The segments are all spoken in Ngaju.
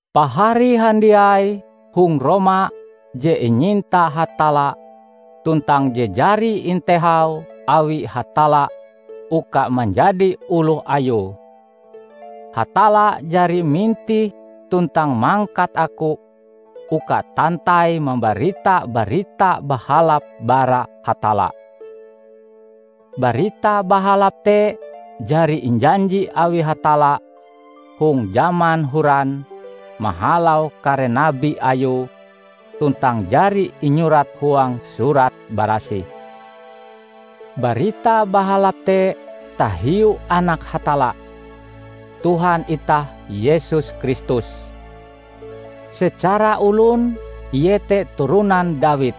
Pahari handiai hong Roma je inyinta Hatalla tuntang je jari intehau awi Hatalla uka manjadi oloh Ayue. Hatalla jari mintih tuntang mangkat aku uka tantai mambarita Barita Bahalap bara Hatalla. Barita Bahalap te jari injanji awi Hatalla hong jaman horan mahalau kare nabi Ayue tuntang jari inyurat huang Surat Barasih. Barita Bahalap te tahiu Anak Hatalla, Tuhan itah Yesus Kristus. Secara olon Ie te turonan Dawid,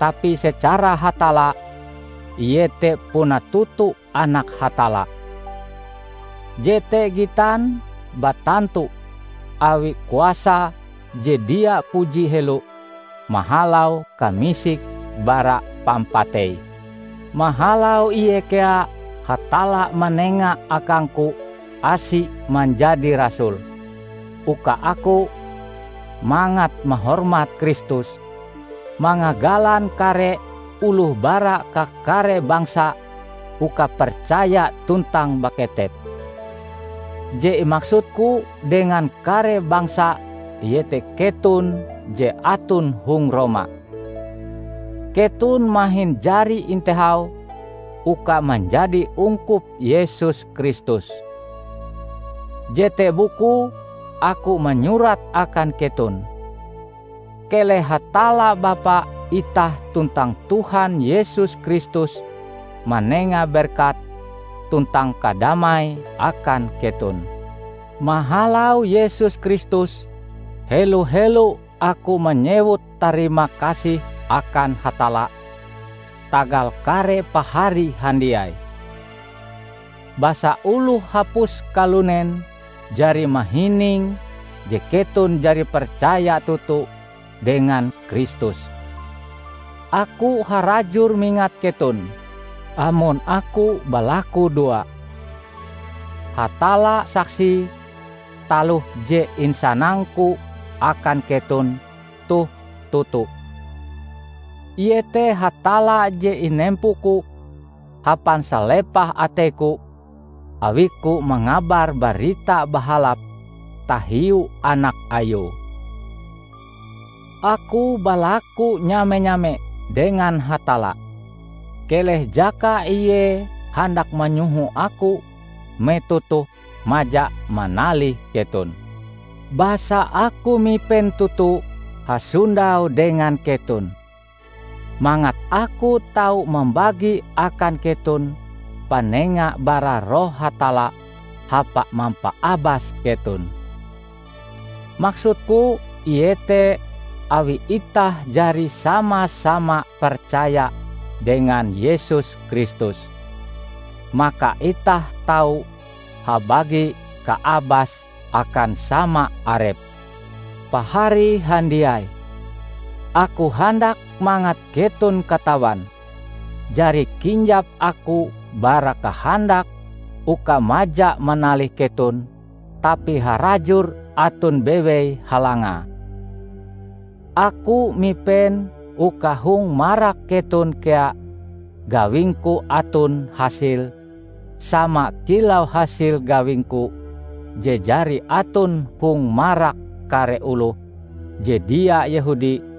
tapi secara hatalla ie te puna toto Anak Hatalla. Jete gitan batantu awi kuasa je dia puji helo mahalau kamisike bara pampatei. Mahalau Ie kea Hatalla manenga akangku asi manjadi rasul, uka aku -- mangat mahormat Kristus -- mangagalan kare oloh bara kakare bangsa uka percaya tuntang baketep. Je imaksudku dengan kare bangsa iete keton je aton hong Roma; keton mahin jari intehau uka manjadi ungkup Yesus Kristus. Jete bukue aku manyurat akan keton. Keleh Hatalla Bapa itah tuntang Tuhan Yesus Kristus manenga berkat tuntang kadamai akan keton. Mahalau Yesus Kristus, helo-helo aku manyewut tarima kasih akan Hatalla tagal kare Pahari handiai; basa oloh hapus kalunen jari mahining je keton jari percaya toto dengan Kristus. Aku harajur mingat keton amon aku balakudoa. Hatalla saksie taloh je insanangku akan keton toh toto. Iete Hatalla je inempoku hapan salepah ateiku awiku mangabar Barita Bahalap tahiu Anak Ayue. Aku balaku nyame-nyame dengan Hatalla, keleh jaka Ie handak manyoho aku metoh toh maja manalih keton. Basa aku mipen toto hasondau dengan keton mangat aku tau mambagi akan keton panenga bara Roh Hatalla hapa mampaabas keton. Maksudku iete awi itah jari sama-sama percaya dengan Yesus Kristus, maka itah tau habagi kaabas akan sama arep. Pahari handiai! Aku handak mangat keton katawan jari kinjap aku bara kahandak uka maja manalih keton tapi harajur aton bewei halangae. Aku mipen uka hong marak keton kea gawingku aton hasile sama kilau hasil gawingku je jari aton hong marak kare oloh je dia Yehudi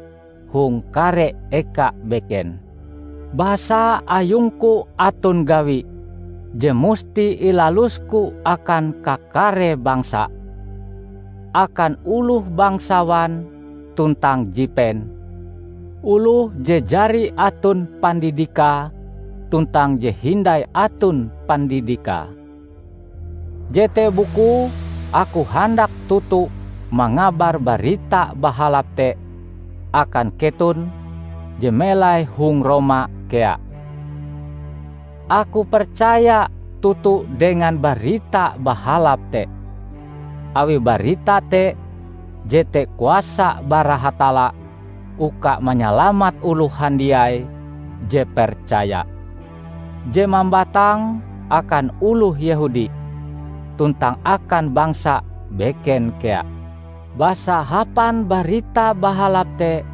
hong kare eka beken. Basa ayungku aton gawi je musti ilalusku akan kakare bangsa: Akan oloh bangsawan tuntang jipen, oloh je jari aton pandidikae tuntang je hindai aton pandidikae. Jete bukue aku handak toto mangabar Barita Bahalap te akan keton je melai hong Roma kea. Aku percaya toto dengan Barita Bahalap te, awi barita te jete kuasa bara Hatalla uka manyalamat oloh handiai je percaya; je mambatang akan oloh Yehudi, tuntang akan bangsa beken kea. Basa hapan Barita Bahalap te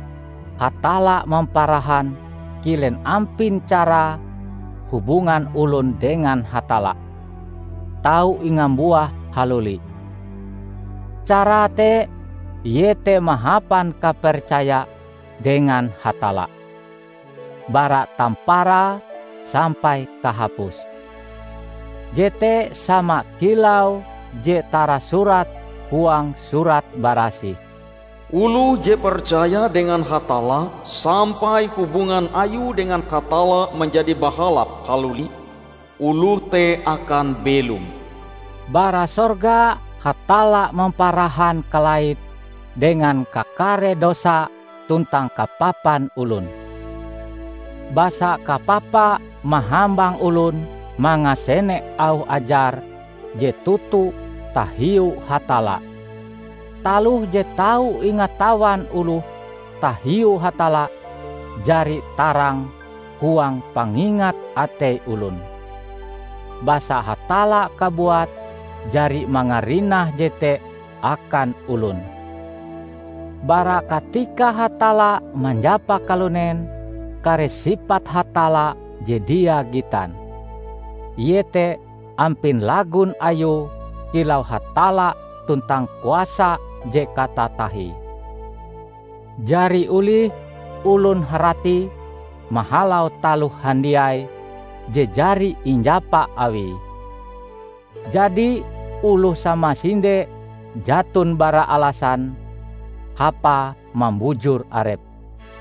Hatalla mamparahan kilen ampin carae hubungan olon dengan Hatalla tau ingambuah haluli; carae te iete mahapan kapercaya dengan Hatalla, bara tamparae sampai kahapuse. Jete sama kilau je tarasurat huang Surat Barasih, "Oloh je percaya dengan Hatalla sampai hubungan ayue dengan Hatalla manjadi bahalap haluli, oloh te akan belom!" Bara sorga Hatalla mamparahan kalaite dengan kakare dosa tuntang kapapan olon, basa kapapa mahambang olon mangasene auh ajar je toto tahiu Hatalla. Taloh je tau ingatawan oloh tahiu Hatalla jari tarang huang pangingat atei olon, basa Hatalla kabuat jari mangarinah jete akan olon. Bara katika Hatalla manjapa kalunen, kare sipat Hatalla je dia gitan, iete ampin lagon Ayue kilau Hatalla tuntang kuasa je katatahie, jari olih olon haratie mahalau taloh handiai je jari injapa Awie. Jadi oloh samasinde jaton bara alasan hapae mambujur arepe.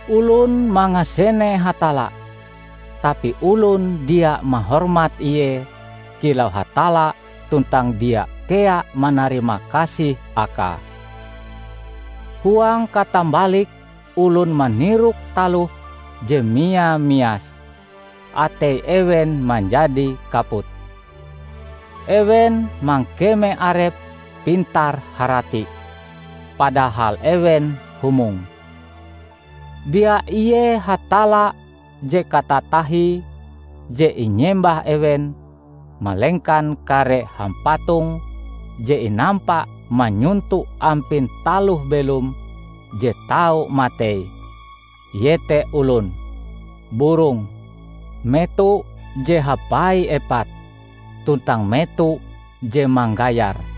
Olon mangasene Hatalla, tapi olon dia mahormat Ie kilau Hatalla tuntang dia kea manarimakasih Akae. Huang katambalike olon manirok taloh je mia-mias; atei ewen manjadi kaput. Ewen mangkeme arepe pintar-harati, padahal ewen humong. Dia ie Hatalla je katatahie je inyembah ewen malengkan kare hampatong je inampa manyonto ampin taloh-belom je tau matei; iete olon, burong, meto je hapai epat, tuntang meto je manggayar.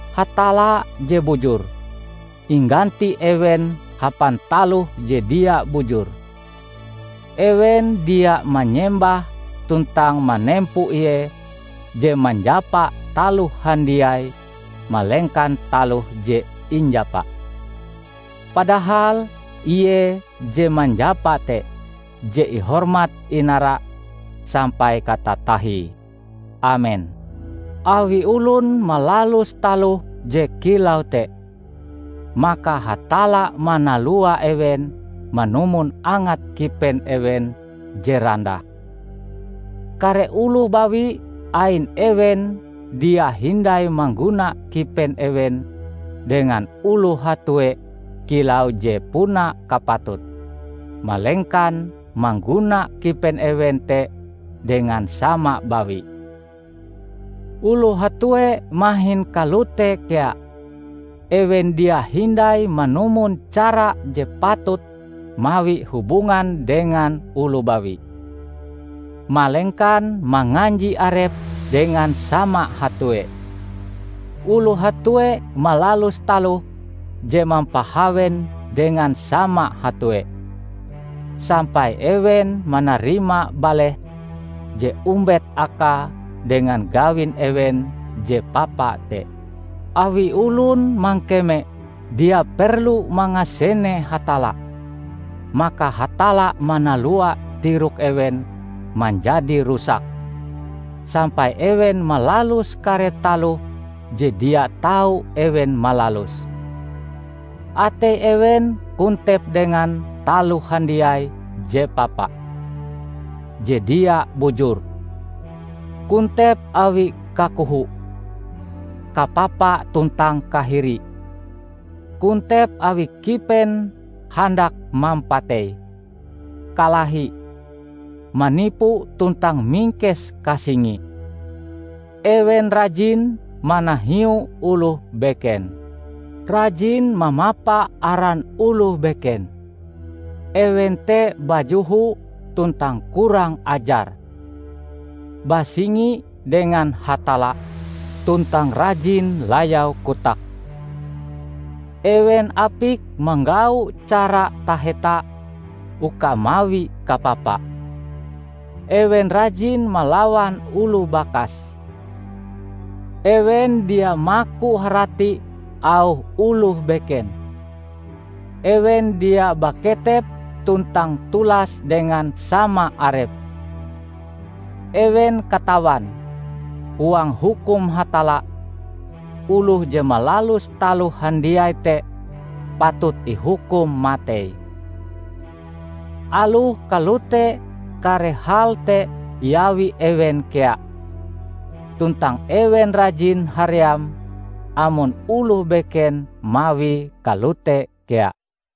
Hatalla je bujur, ingganti ewen hapan taloh je dia bujur. Ewen dia mayembah tuntang manempo Ie je manjapa taloh handiai malengkan taloh je injapa. Padahal Ie je manjapa te je ihormat-inara sampai katatahie! Amen. Awi olon malalus taloh je kilau te, maka Hatalla manalua ewen manumon angat kipen ewen je randah. Kare oloh bawi ain ewen dia hindai mangguna kipen ewen dengan oloh hatue kilau je puna kapatute, malengkan mangguna kipen ewen te dengan sama bawi. Oloh hatue mahin kalote kea; ewen dia hindai manumon cara je patut mawi hubungan dengan oloh bawi, malengkan manganji arepe dengan sama hatue. Oloh hatue malalus taloh je mampahawen dengan sama hatue, sampai ewen manarima baleh je ombet akae dengan gawin ewen je papa te. Awi olon mangkeme dia perlu mangasene Hatalla, maka Hatalla manalua tirok ewen manjadi rusak, sampai ewen malalus kare taloh je dia tau ewen malaluse. Atei ewen kontep dengan taloh handiai je papa, je dia bujur; kontep awi kakoho, kapapa tuntang kahiri; kontep awi kipen handak mampatei, kalahi, manipu tuntang mingkes kasingi. Ewen rajin manahiu oloh beken, rajin mamapa aran oloh beken; ewen te bajoho tuntang kurang ajar, basingi dengan Hatalla tuntang rajin layau kotake. Ewen apik manggau cara taheta uka mawi kapapa. Ewen rajin malawan oloh bakas; ewen dia maku harati auh oloh beken; ewen dia baketep tuntang tulas dengan sama arepe. Ewen katawan, huang hukum Hatalla, oloh je malalus taloh handiai te patut ihukum matei. Aloh kalote kare hal te iawi ewen kea; tuntang ewen rajin haream amon oloh beken mawie kalote kea.